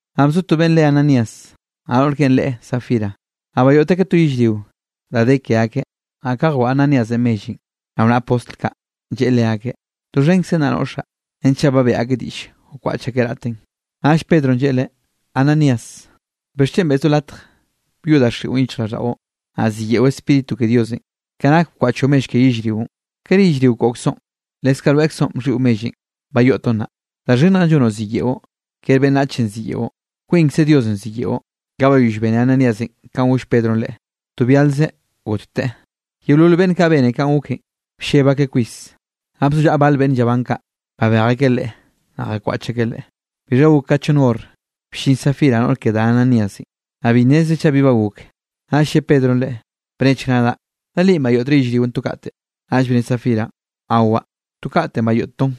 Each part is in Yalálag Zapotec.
Naꞌ bzo to beꞌnn re Ananías, naꞌ noꞌr keꞌe re Safira, naꞌ bayoꞌt akeꞌ to yellrio da de ke akeꞌ. Naꞌ ka jwaꞌa Ananíasenꞌ mellenꞌ rao naꞌa postl kaꞌ, lleꞌe leakeꞌ: —Doxhenkzen naꞌ noꞌxaꞌ. Renchaꞌ ba beꞌe akeꞌ diꞌll wkwaꞌch akeꞌ raꞌten. Naꞌll Pedronꞌ lleꞌe leꞌe: —Ananías, ¿bixchen beꞌzoꞌ latj byoꞌ daxiꞌon yichjraꞌlldaꞌon, naꞌ ziyeꞌo Spíritu ke Diosenꞌ ke nak bkwaꞌchoꞌ mell ke yellrionꞌ? ¿Kere yellrio koꞌkzoꞌn? Leskaꞌ rweꞌkzoꞌ bxhiꞌo mellenꞌ bayoꞌtoꞌn naꞌ. Da xhinnjenꞌ llonoꞌ ziyeꞌo. Kere beꞌnnachenꞌ ziyeꞌo, kwinkze Diosenꞌ ziyeꞌo. Ka bayoll bene Ananíasenꞌ kanꞌ goll Pedronꞌ leꞌen, to byalzeꞌ gotteꞌ. Yeolol beꞌnn kaꞌ bene kanꞌ goken, blleb akeꞌ kwis. Naꞌ bzollaꞌa bal beꞌnn llabán kaꞌ, babej akeꞌ leꞌe, naꞌ jakwaꞌch akeꞌ leꞌe. Bixha gok ka chonn hor, bllin Safira noꞌr ke da Ananíasenꞌ, naꞌ bi nnezreꞌ chaꞌ bi ba gok. Naꞌll lle Pedronꞌ leꞌe: —Bnechk nadaꞌ, ¿da linꞌ bayoꞌtre yellrionꞌ to kaꞌte? Naꞌll bne Safiranꞌ: —Awaꞌ, to katenꞌ bayoꞌttoꞌn.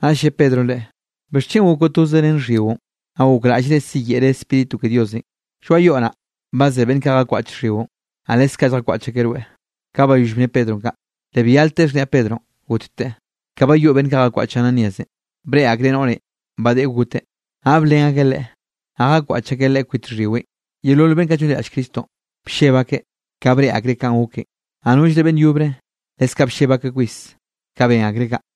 Naꞌll lle Pedronꞌ leꞌe: —¿Bixchen gokoꞌ toze ren xhyiꞌon, naꞌ gokraꞌllre siyeꞌre Spíritu ke Diosenꞌ? Lloaꞌ yoꞌ naꞌ, ba ze beꞌnn kaꞌ jakwaꞌch xhyiꞌon, naꞌ leskaꞌ lljakwaꞌch akeꞌ rweꞌ. Ka bayoll bne Pedronꞌ kaꞌ, le byalteꞌ xhniaꞌ Pedronꞌ gotteꞌ. Ka bayoꞌ beꞌnn kaꞌ jakwaꞌch Ananíasenꞌ, breꞌe akreꞌ noꞌrenꞌ ba deꞌe goteꞌ, naꞌ blen akeꞌ leꞌe, naꞌ jakwaꞌch akeꞌ leꞌe kwit xhyiweꞌn. Yeolol beꞌnn kaꞌ llonliraꞌll Cristonꞌ, blleb akeꞌ ka breꞌe akreꞌ kanꞌ goken, naꞌ nollre beꞌnn yobre leskaꞌ blleb akeꞌ kwis ka ben akreꞌ kaꞌ.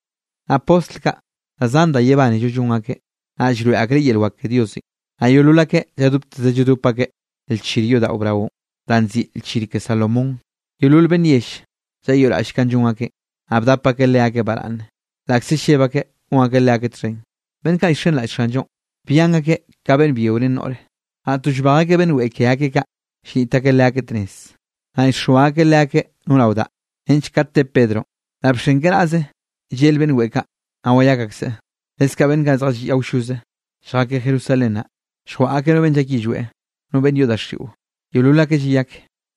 Naꞌ postl kaꞌ da zan da yebánello llon akeꞌ, naꞌ llroeꞌ akeꞌ yel wak ke Diosenꞌ. Naꞌ yeolol akeꞌ lladopteze lladop akeꞌ lchir yodaꞌo braonꞌ, danꞌ nziꞌi Lchir ke Salomón. Yeolol beꞌnn yell llayoꞌraꞌll kanꞌ llon akeꞌn, naꞌ bdap akeꞌ leakeꞌ baraꞌnne, laꞌkze lleb akeꞌ gon akeꞌ leakeꞌ txhen. Beꞌnn kaꞌ llxenraꞌll Xanllonꞌ, byan akeꞌ ka beꞌnn byio ren noꞌre. Naꞌ to llbej akeꞌ beꞌnn weꞌe ke akeꞌ kaꞌ, llniꞌt akeꞌ leakeꞌ tnez. Naꞌ llxoa akeꞌ leakeꞌ no rao daꞌ, nench kat te Pedronꞌ, laꞌ bxen keꞌe naz llel beꞌnn weꞌe kaꞌ, naꞌ wayak akseꞌ. Leskaꞌ beꞌnn kaꞌ zjalliꞌ awlloze lljakeꞌ Jerusalén naꞌ, lljwaꞌa akeꞌ no beꞌnn llak yillweꞌ, no beꞌnn yoꞌ daxiꞌo, yeolol akeꞌ llayak.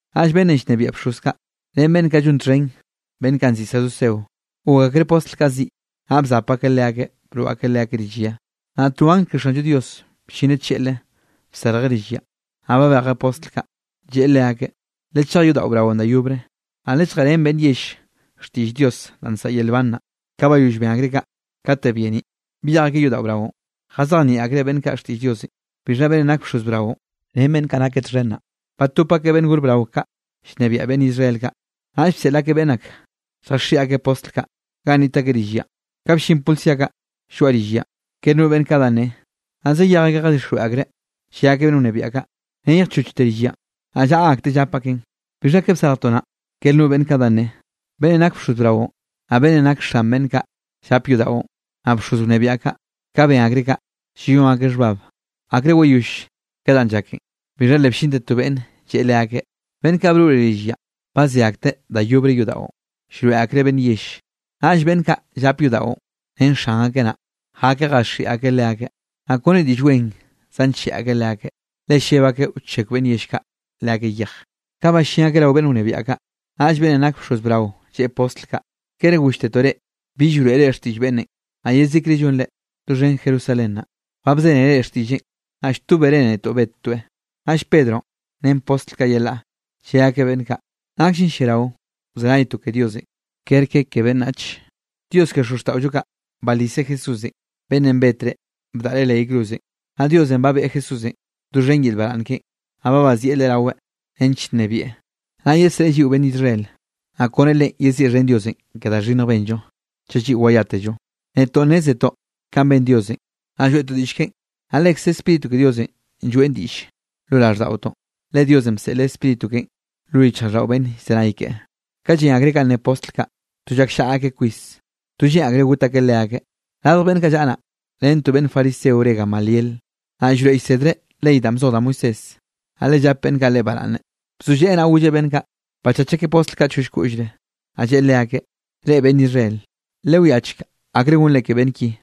Naꞌll beꞌnnenꞌ llnebiaꞌ bxoz kaꞌ, ren beꞌnn kaꞌ llon txhen beꞌnn kaꞌ nziꞌi saduceo, gok akreꞌ postl kaꞌ ziꞌ. Naꞌ bzap akeꞌ leakeꞌ broꞌ akeꞌ leakeꞌ rill ya. Naꞌ to angl ke Xanllo Dios bllineꞌ tlleꞌle, bsarjeꞌ rill yanꞌ, naꞌ babejeꞌ postl kaꞌ, lleꞌe leakeꞌ: —Lechej yodaꞌo braonꞌ da yobre, naꞌ lelljeꞌrén beꞌnn yell xtiꞌll Dios da nsaꞌa yel nban naꞌ. Ka bayoll ben akreꞌ kaꞌ, kate byeniꞌ, byej akeꞌ yodaꞌo braonꞌ, jazejnieꞌ akreꞌ beꞌnn kaꞌ xtiꞌll Diosenꞌ. Bixha beꞌnnenꞌ nak bxoz brao, ren beꞌnn kaꞌ nakeꞌ txhen naꞌ, batop akeꞌ beꞌnn gor brao kaꞌ llnebiaꞌ beꞌnn Israel kaꞌ, naꞌll bseꞌl akeꞌ beꞌnn ak lljaxhiꞌi akeꞌ postl kaꞌ, ganꞌ niꞌt akeꞌ rill yanꞌ. Ka bllin policía kaꞌ lloaꞌ rill yanꞌ, ker no beꞌnn kaꞌ da nne. Naꞌ zayej akeꞌ jadixjweꞌ akreꞌ, lle akeꞌ beꞌnn wnebiaꞌ kaꞌ: —Neyjchochte rill yanꞌ, naꞌ llaꞌa akteꞌ llap akeꞌn, bixha ke bsarjtoꞌn naꞌ, ker no beꞌnn kaꞌ da nne. Beꞌnnenꞌ nak bxoz brao, naꞌ beꞌnnenꞌ nak xan beꞌnn kaꞌ llap yodaꞌon, naꞌ bxoz wnebiaꞌ kaꞌ, ka ben akreꞌ kaꞌ, llayón akeꞌ xhbab akre wayoll ke danꞌ llaken. Bixha le bllinte to beꞌnn, lleꞌe leakeꞌ: —Beꞌnn kaꞌ broꞌre rill yanꞌ, ba ze akteꞌ da yobre yodaꞌon llroeꞌ akreꞌ beꞌnn yell. Naꞌll beꞌnn kaꞌ llap yodaꞌon ren xan akeꞌ naꞌ, jakeꞌ jaxhiꞌi akeꞌ leakeꞌ, naꞌ kone diꞌll wen zancheꞌe akeꞌ leakeꞌ, le lleb akeꞌ wchekw beꞌnn yell kaꞌ leakeꞌ yej. Ka ballín akeꞌ rao beꞌnn wnebiaꞌ kaꞌ, naꞌll beꞌnnenꞌ nak bxoz brao lleꞌe postl kaꞌ: —¿Kere golltetoꞌ reꞌ, bill wroeꞌre xtiꞌll beꞌnnenꞌ? Naꞌ yezikre llonre, doxhen Jerusalén naꞌ, ba bzénere xtiꞌlleꞌn, naꞌ lltóbere netoꞌ bettoeꞌ. Naꞌll Pedronꞌ ren postl kaꞌ yelaꞌ, lle akeꞌ beꞌnn kaꞌ: —Nakllen lliarao wzenaytoꞌ ke Diosenꞌ kerke ke beꞌnnach. Dios ke xozxtaꞌollo kaꞌ baliseꞌ Jesúsenꞌ, beꞌnnenꞌ betre bdaꞌre leꞌ yay cruzenꞌ. Naꞌ Diosenꞌ ba beꞌe Jesúsenꞌ doxhen yel baraꞌnn keꞌen, naꞌ ba bazieꞌ Leꞌe raweꞌ, nench nnebieꞌ, naꞌ yesreꞌe lliꞌo beꞌnn Israel. Naꞌ kone Leꞌen yeziꞌxhen Diosenꞌ ke da xhinnjenꞌ benllo, chaꞌ lliꞌo wayátello. Netoꞌ nnézetoꞌ kanꞌ ben Diosenꞌ, naꞌ lloeꞌtoꞌ diꞌll keꞌen, naꞌ lekze Spíritu ke Diosenꞌ lloeꞌn diꞌll lo raꞌlldaꞌotoꞌn, le Diosenꞌ bseꞌleꞌ Spíritu keꞌen lo yichjraꞌlldaꞌo beꞌnn llzenay keꞌe. Ka llen akreꞌ kanꞌ ne postl kaꞌ, to llakllaꞌa akeꞌ kwis, to lleꞌn akreꞌ got akeꞌ leakeꞌ. Radj beꞌnn kaꞌ llaꞌa naꞌ, ren to beꞌnn fariseo re Gamaliel, naꞌ llroeꞌ llsedreꞌ ley danꞌ bzoj da Moisés, naꞌ le llap beꞌnn kaꞌ leꞌe baraꞌnne. Bzolleꞌe naꞌ golleꞌ beꞌnn kaꞌ, bachach akeꞌ postl kaꞌ choll koꞌllre. Naꞌ lleꞌe leakeꞌ: —Reꞌ, beꞌnn Israel, lewiachek akre gonre ke beꞌnn ki.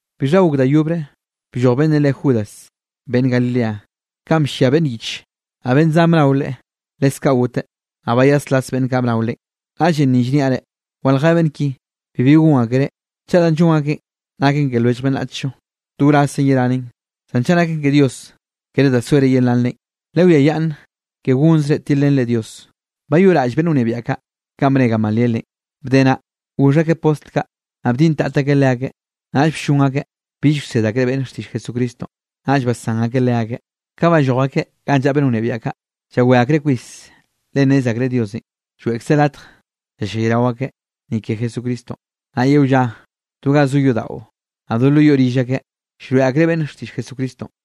Bixha gok da yobre blloj beꞌnnenꞌ re Judas, beꞌnn Galilea, kanꞌ bllia beꞌnn yiche, naꞌ beꞌnn zan bnao leꞌe, leskaꞌ goteꞌ, naꞌ bayaslas beꞌnn kaꞌ bnao leꞌen. Naꞌllenꞌ ni llniaꞌ reꞌ, waljé beꞌnn ki, bibi gon akereꞌ. Chaꞌ danꞌ llon akeꞌn naken ke lwellj beꞌnnachllo, to wrazzen yeranen. Zan chaꞌ naken ke Dios, kere da soere yelanren, lewiayaꞌnn ke gonzre tilrenre Dios. Bayoꞌraꞌll beꞌnn wnebiaꞌ kaꞌ kanꞌ bne Gamalielenꞌ. Bde naꞌ, goxh akeꞌ postl kaꞌ, naꞌ bdintat akeꞌ leakeꞌ, naꞌll bllon akeꞌ bill wsed akreꞌ beꞌnn xtiꞌll Jesucristonꞌ, naꞌll basán akeꞌ leakeꞌ. Ka balloj akeꞌ ganꞌ llaꞌa beꞌnn wnebiaꞌ kaꞌ, llawé akreꞌ kwis, le nnez akreꞌ Diosenꞌ lloeꞌkzeꞌ latj llallayrao akeꞌ, ni ke Jesucristonꞌ. Naꞌ yeo lla, do ga zo yodaꞌo, naꞌ do lo yoꞌ rill akeꞌ, llroeꞌ akreꞌ beꞌnn xtiꞌll Jesucristonꞌ.